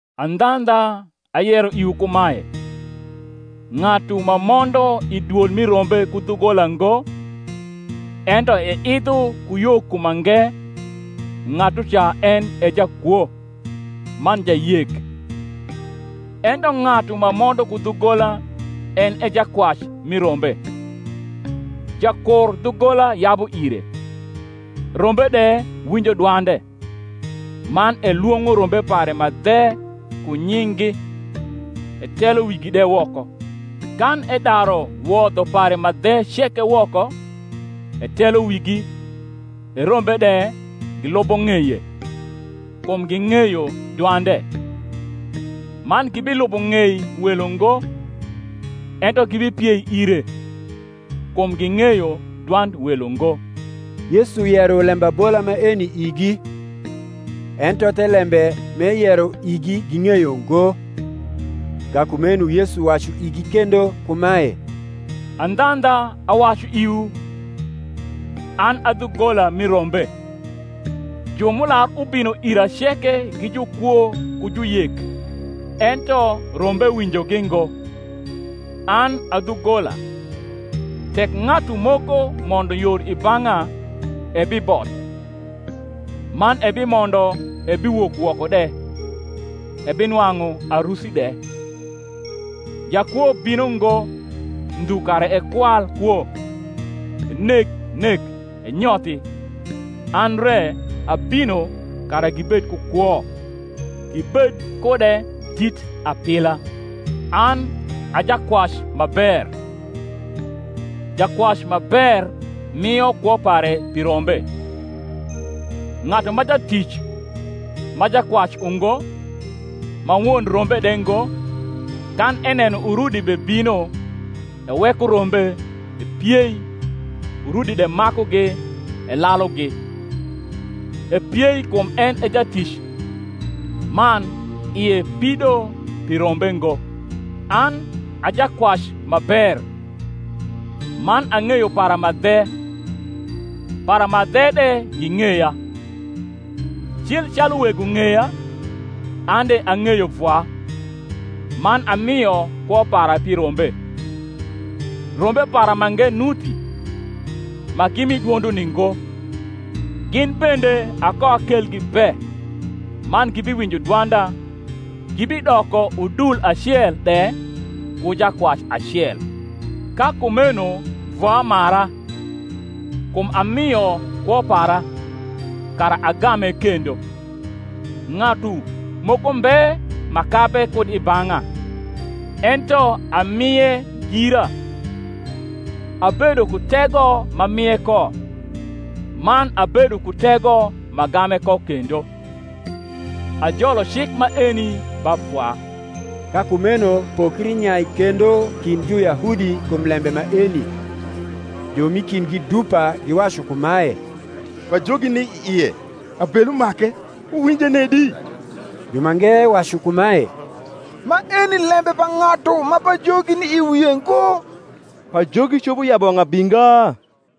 Andhandha, ayero iwu kumae, ng’atu ma mondo i dwol mi rombe ku dhugola ngo, ento eidho ku yo ku mange, ng’atuca en e jakwo, man jayek. Ento ng’atu ma mondo ku dhugola en e jakwac mi rombe. Jakur dhugola yabu ire; rombe de winjo dwande: man elwong’o rombe pare ma dhe ku nying’gi, etelo wigi de woko. Kan edaru wodho pare ma dhe ceke woko, etelo wigi, e rombe de gilubo ng’eye: kum ging’eyo dwande. Man gibilubo ng’ei welo ngo, ento gibipiei ire: kum ging’eyo dwand welo ngo. Yesu yero lembabola maeni igi: ento thelembe m’eyero igi ging’eyo ngo. Ka kumeno Yesu wacu igi kendo kumae, Andhandha, awacu iwu, An a dhugola mi rombe. Ju m’ular ubino ira ceke gi jukwo ku juyek: ento rombe winjogi ngo. An a dhugola; tek ng’atu moko mondo yor i bang’a, ebiboth, man ebimondo ebiwok woko de, ebinwang’u arusi de. Jakwo bino ngo, ndhu kara ekwal kwo, eneg nek, enyothi: an re abino kara gibed ku kwo, gibed kude dit apila. An a jakwac ma ber: jakwac ma ber mio kwo pare pi rombe. Ng’atu ma jatic, ma jakwac ungo, ma won rombe de ngo, kan eneno urudi bebino, eweko rombe, epiei, urudi de makugi, elalugi: epiei kum en e jatic, man ie pido pi rombe ngo. An a jakwac ma ber; man ang’eyo para ma dhe, para ma dhe de ging’eya, cil calu Wego ng’eya, an de ang’eyo Vwa; man amio kwo para pi rombe. Rombe para mange nuti, ma gi mi dwonduni ngo: gin bende akoakelgi be, man gibiwinjo dwanda; gibidoko udul acel de, ku jakwac acel. Ka kumeno Vwa mara, kum amio kwo para, kara agame kendo. Ng’atu moko mbe ma kabe kud i bang’a, ento amie gira. Abedo ku tego m’amie ko, man abedo ku tego m’agame ko kendo. Ajolo cik maeni ba Vwa. Ka kumeno pokri nyai kendo kind Juyahudi kum lembe maeni. Ju m’i kindgi dupa giwacu kumae, Pajogi ni i ie, abelu make; wuwinje nedi? Jumange wacu kumae, Maeni lembe pa ng’atu ma pajogi ni i wie ngo. Pajogi copo yabu wang’ abinga?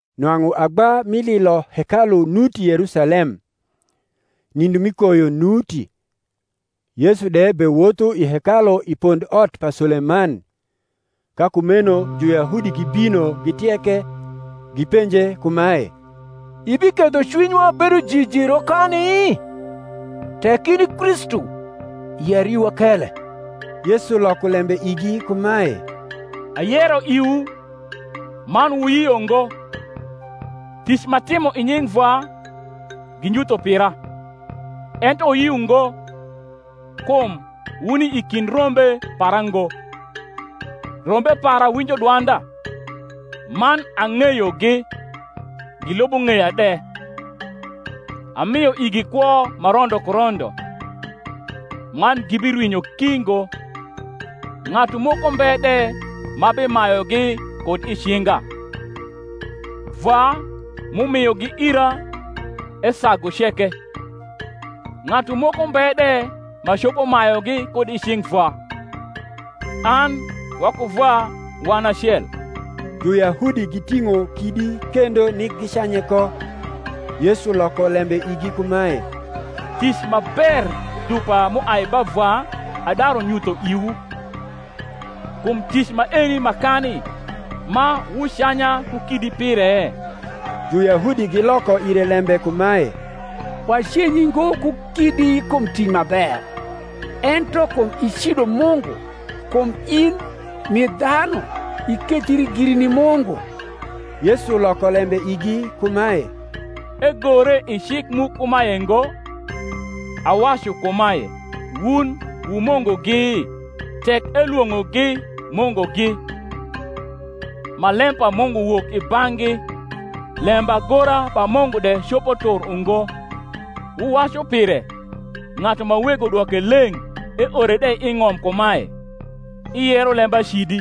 Nwang’u agba mi lilo hekalu nuti Yerusalem: nindo mi koyo nuti; Yesu de bewotho i hekalu i pondot pa Suleman. Ka kumeno Juyahudi gibino gitieke, gipenje kumae, Ibiketho cwinywa bedo jiji rokani? Tek in i Kristu, yer iwa kele. Yesu loko lembe igi kumae, Ayero iwu, man wuyio ngo: tic m’atimo i nying’ Vwa ginyutho pira. Ento wuyio ngo, kum wuni i kind rombe para ngo. Rombe para winjo dwanda, man ang’eyogi, gilubo ng’eya de: amio igi kwo ma rondo ku rondo; man gibirwinyo ki ngo, ng’atu moko mbe de ma bimayugi kud i cinga. Vwa, m’umiogi ira, esagu ceke: ng’atu moko mbe de, ma copo mayugi kud i cing’ Vwa. An waku Vwa wan acel. Juyahudi giting’o kidi kendo nik gicanye ko. Yesu loko lembe igi kumae, Tic ma ber dupa m’uai ba Vwa adaru nyutho iwu; kum tic maeni ma kani ma wucanya ku kidi pire? Juyahudi giloko ire lembe kumae, Wacenyi ngo ku kidi kum tic ma ber, ento kum icido Mungu; kum in, m’i dhanu, ikethri giri ni Mungu. Yesu loko lembe igi kumae, Egore i cik mu kumae ngo, Awacu kumae, Wun wu mungugi? Tek elwong’ogi mungugi, ma lem pa Mungu wok i bang’gi (lembagora pa Mungu de copo tur ungo), wuwacu pire, ng’atu ma Wego dwoke leng’ eore de i ng’om kumae, Iyero lembacidi;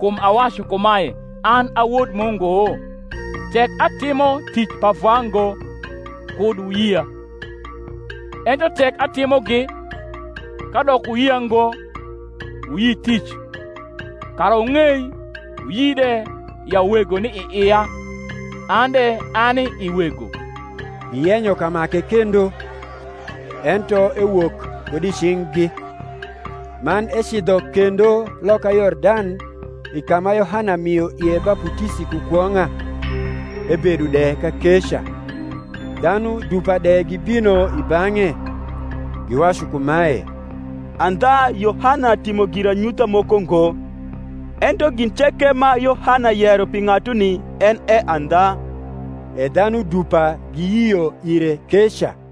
kum awacu kumae, An a Wod Mungu? Tek atimo tic pa Vwa ngo, kud wuyia. Ento tek atimogi, kadok wuyia ngo, wuyi tic: kara wung’ei wuyi de ya Wego ni i ia, an de ani i Wego. Giyenyo kamake kendo: ento ewok kud i cing’gi. Man ecidho kendo loka Yordan i ka ma Yohana mio ie baputisi ku kwong’a; ebedo de kakeca. Dhanu dupa de gibino i bang’e; giwacu kumae, Andha Yohana timo giranyutha moko ngo: ento gin ceke ma Yohana yero pi ng’atuni en e andha. E dhanu dupa giyio ire keca.